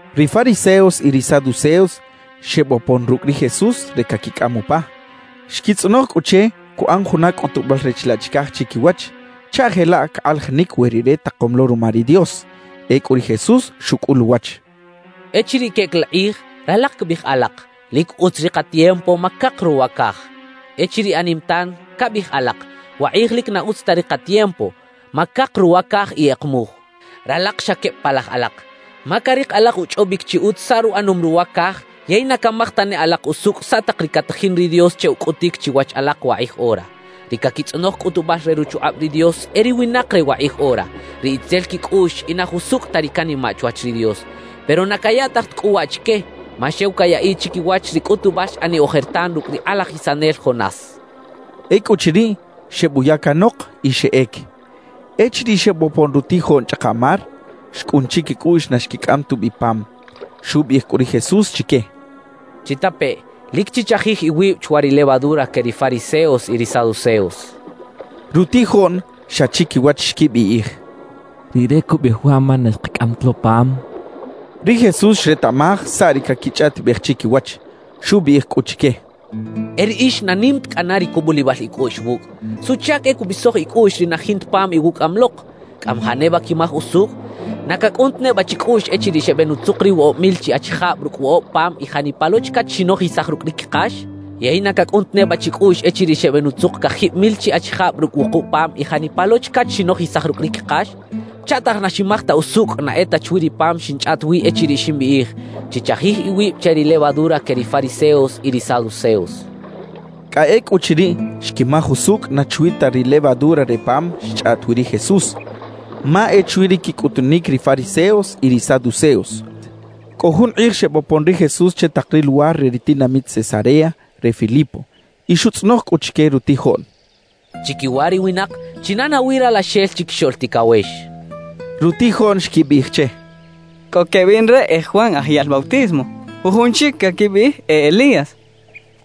Ri fariseos y ri saduceos xebopon rucꞌ ri Jesús re caquicꞌam upa. Xquitzꞌonoj cꞌu che cuꞌan juna cꞌutubal re chilaꞌ chicaj chiquiwach chaꞌ jelaꞌ cakꞌalajinic we Rire takom lo ruma ri Dios. Ecꞌu ri Jesús xucꞌul uwach: «Echiriꞌ queꞌec la kꞌij, ralak cabiꞌij alak: “Lic utz ri katiempo ma cak ruwa caj.” Echiriꞌ anim tan, cabiꞌij alak: “Wakꞌij lic na utz ta ri katiempo. ma cak ruwa caj y kꞌekmuj.” ¡Ralak xa queb palaj alak! Ma carik alak uchꞌobic chi utz saꞌ ruꞌanom ruwa caj, yey na camaj tane alak usucꞌ saꞌ tak ri catajin ri Dios che ucꞌutic chiwach alak wakꞌij ora. Ri caquitzꞌonoj cꞌutubal re ruchukꞌab ri Dios e ri winak re wakꞌij ora, ri itzel quicꞌuꞌx y na jusucꞌ ta ri canimaꞌ chwach ri Dios. Pero na cayaꞌtaj ta cꞌu waꞌ chique, ma xew cayaꞌiꞌ chiquiwach ri cꞌutubal xꞌaniꞌ ojertan rucꞌ ri kꞌalajisanel Jonás» xchaꞌ. Ecꞌuchiriꞌ, xebuya canok y xeꞌec. Echiriꞌ xebopon rutijoꞌn chꞌaka mar, xcꞌun chiquicꞌuꞌx na xquicꞌam tubi pam. Xubiꞌij cꞌu ri Jesús chique: —Chitapeꞌ: Lic chichajij iwib chwa ri levadura que ri fariseos y ri saduceos —xchaꞌ. Rutijoꞌn xa chiquiwach xquibiꞌij: «Rire cubiꞌij waꞌ, ma na xkacꞌam ta lo pam» xechaꞌ. Ri Jesús xretaꞌmaj saꞌ ri caquichꞌaꞌtibej chiquiwach, xubiꞌij cꞌu chique: —¡E riꞌix na nim ta cꞌana ri cubulibal icꞌuꞌx wucꞌ! ¿Suꞌchac e cubisoj icꞌuꞌx ri na jinta pam iwucꞌaꞌam lok? ¿Cꞌamajaꞌ neba quimaj usucꞌ? ¿Na cacꞌun ta neba chicꞌuꞌx echiriꞌ xebenutzuk ri woꞌob mil chi achijab rucꞌ woꞌob pam y janipa lo chacach xinojisaj rucꞌ ri quikax? ¿Yey na cacꞌun ta neba chicꞌuꞌx echiriꞌ xebenutzuk cajib mil chi achijab rucꞌ wukub pam y janipa lo chacach xinojisaj rucꞌ ri quikax? ¿Chaꞌtaj na ximaj ta usucꞌ na e ta chwi ri pam xinchꞌaꞌt wi echiriꞌ ximbiꞌij: “Chichajij iwib che ri levadura que ri fariseos y ri saduceos”? —xchaꞌ. Cꞌa ecꞌuchiriꞌ xquimaj usucꞌ na chwi ta ri levadura re ri pam xchꞌaꞌt wi ri Jesús, ma e chwi ri quicꞌutunic ri fariseos y ri saduceos. Cꞌo jun kꞌij xebopon ri Jesús che tak ri luwar re ri tinamit Cesarea re Filipo, y xutzꞌonoj cꞌu chique rutijoꞌn: —Chiquiwa ri winak, ¿china nawi Ralaxel Chiquixoꞌl Ticawex? —xchaꞌ. Rutijoꞌn xquibiꞌij che: —Cꞌo quebiꞌn re e Juan Aj Yaꞌl Bautismo; jujun chic caquibiꞌij e Elías;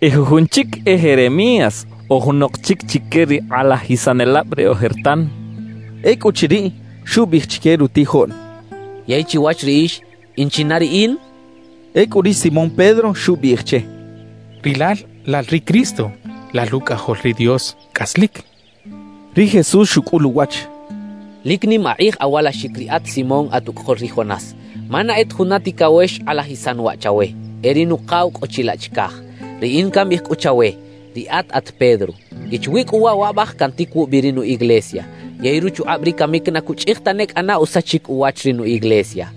y jujun chic, e Jeremías o junok chic chique ri kꞌalajisanelab re ojertan —xechaꞌ. Ecꞌuchiriꞌ, xubiꞌij chique rutijoꞌn: —Yey chiwach riꞌix, ¿in china riꞌin? —xchaꞌ. Ecꞌu ri Simón Pedro xubiꞌij che: —Rilal lal ri Cristo, lal Rucꞌajol ri Dios cꞌaslic —xchaꞌ. Ri Jesús xucꞌul uwach: —Lic nim akꞌij awalaxic riꞌat Simón at ucꞌajol ri Jonás; ma na e ta juna ticawex xkꞌalajisan waꞌ chawe, e ri Nukaw cꞌo chilaꞌ chicaj. Riꞌin cambiꞌij cꞌu chawe: Riꞌat at Pedro. Y chwi cꞌu waꞌ waꞌbaj cantic wubi ri nu iglesia, yey ruchukꞌab ri camic na cuchꞌij tane cꞌana usachic uwach ri nu iglesia.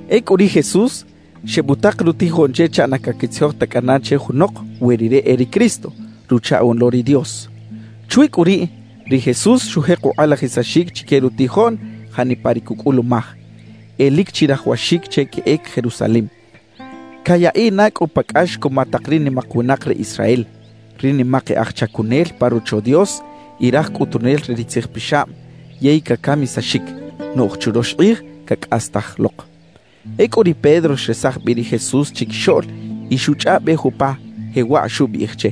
Ecꞌu ri Jesús xebutak rutijoꞌn che chaꞌ na caquitzijoj ta cꞌana che junok we Rire e ri Cristo, Ruchaꞌoꞌn lo ri Dios. Chwi cꞌu riꞌ, ri Jesús xujek ukꞌalajisaxic chique rutijoꞌn janipa ri cucꞌulumaj: E lic chirajawaxic che queꞌec Jerusalem, cayaꞌiꞌ na cꞌu pa cꞌax cuma tak ri nimak winak re Israel, ri nimak e aj chacunel pa Rocho Dios y raj cꞌutunel re ri tzijpixab, yey cacamisaxic; noꞌj churox kꞌij cacꞌastaj lok. Ecꞌu ri Pedro xresaj bi ri Jesús chiquixoꞌl y xuchꞌaꞌbej upa, jewaꞌ xubiꞌij che: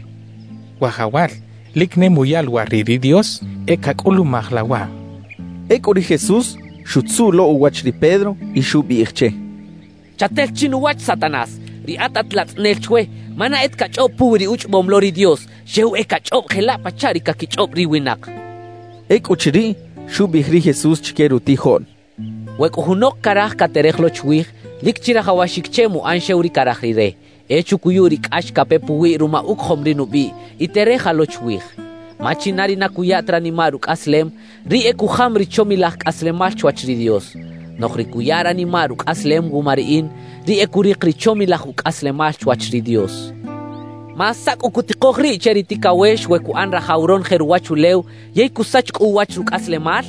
—¡Wajawal, lic ne muya luwar riꞌ ri Dios e cacꞌulumaj la waꞌ! —xchaꞌ. Ecꞌu ri Jesús xutzuꞌ lo uwach ri Pedro y xubiꞌij che: —¡Chatel chinuwach, Satanás! Riꞌat at latzꞌanel chwe, ma na e ta cachꞌob puwi ri uchꞌobom lo ri Dios, xew e cachꞌob jelaꞌ pachaꞌ ri caquichꞌob ri winak —xchaꞌ. Ecꞌuchiriꞌ, xubiꞌij ri Jesús chique rutijoꞌn: —We cꞌo junok caraj caterej lo chwij, lic chirajawaxic che muꞌan xew ri caraj rire, e chucuyu ri cꞌax cape puwiꞌ ruma ucojom ri nubiꞌ, y tereja lo chwij. Ma china ri na cuya ta ranimaꞌ rucꞌaslem, riꞌ e cujam ri chomilaj cꞌaslemal chwach ri Dios; noꞌj ri cuya ranimaꞌ rucꞌaslem wuma riꞌin, riꞌ e curik ri chomilaj ucꞌaslemal chwach ri Dios. Ma ¿saꞌ cꞌu cutikoj riꞌ che ri ticawex we cuꞌan rajaw ronoje ruwachulew yey cusach cꞌu uwach rucꞌaslemal?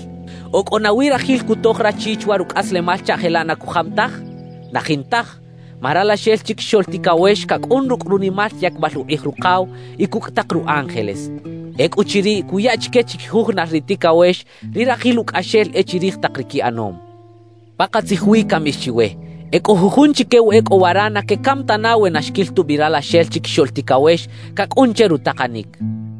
¿O cꞌo nawi rajil cutoj rachi chwa rucꞌaslemal chaꞌ jelaꞌ na cujam taj? ¡Na jintaj! »Ma Ralaxel Chiquixoꞌl Ticawex cacꞌun rucꞌ runimal yacbal ukꞌij Rukaw y cucꞌ tak ru ángeles. Ecꞌuchiriꞌ cuya chique chiquijujunal ri ticawex, ri rajil ucꞌaxel e chirij tak ri quiꞌanom. Pakatzij wi cambiꞌij chiwe: E cꞌo jujun chique wa e cꞌo wara na quecam tana we na xquil tubi Ralaxel Chiquixoꞌl Ticawex cacꞌun che rutakanic —xchaꞌ.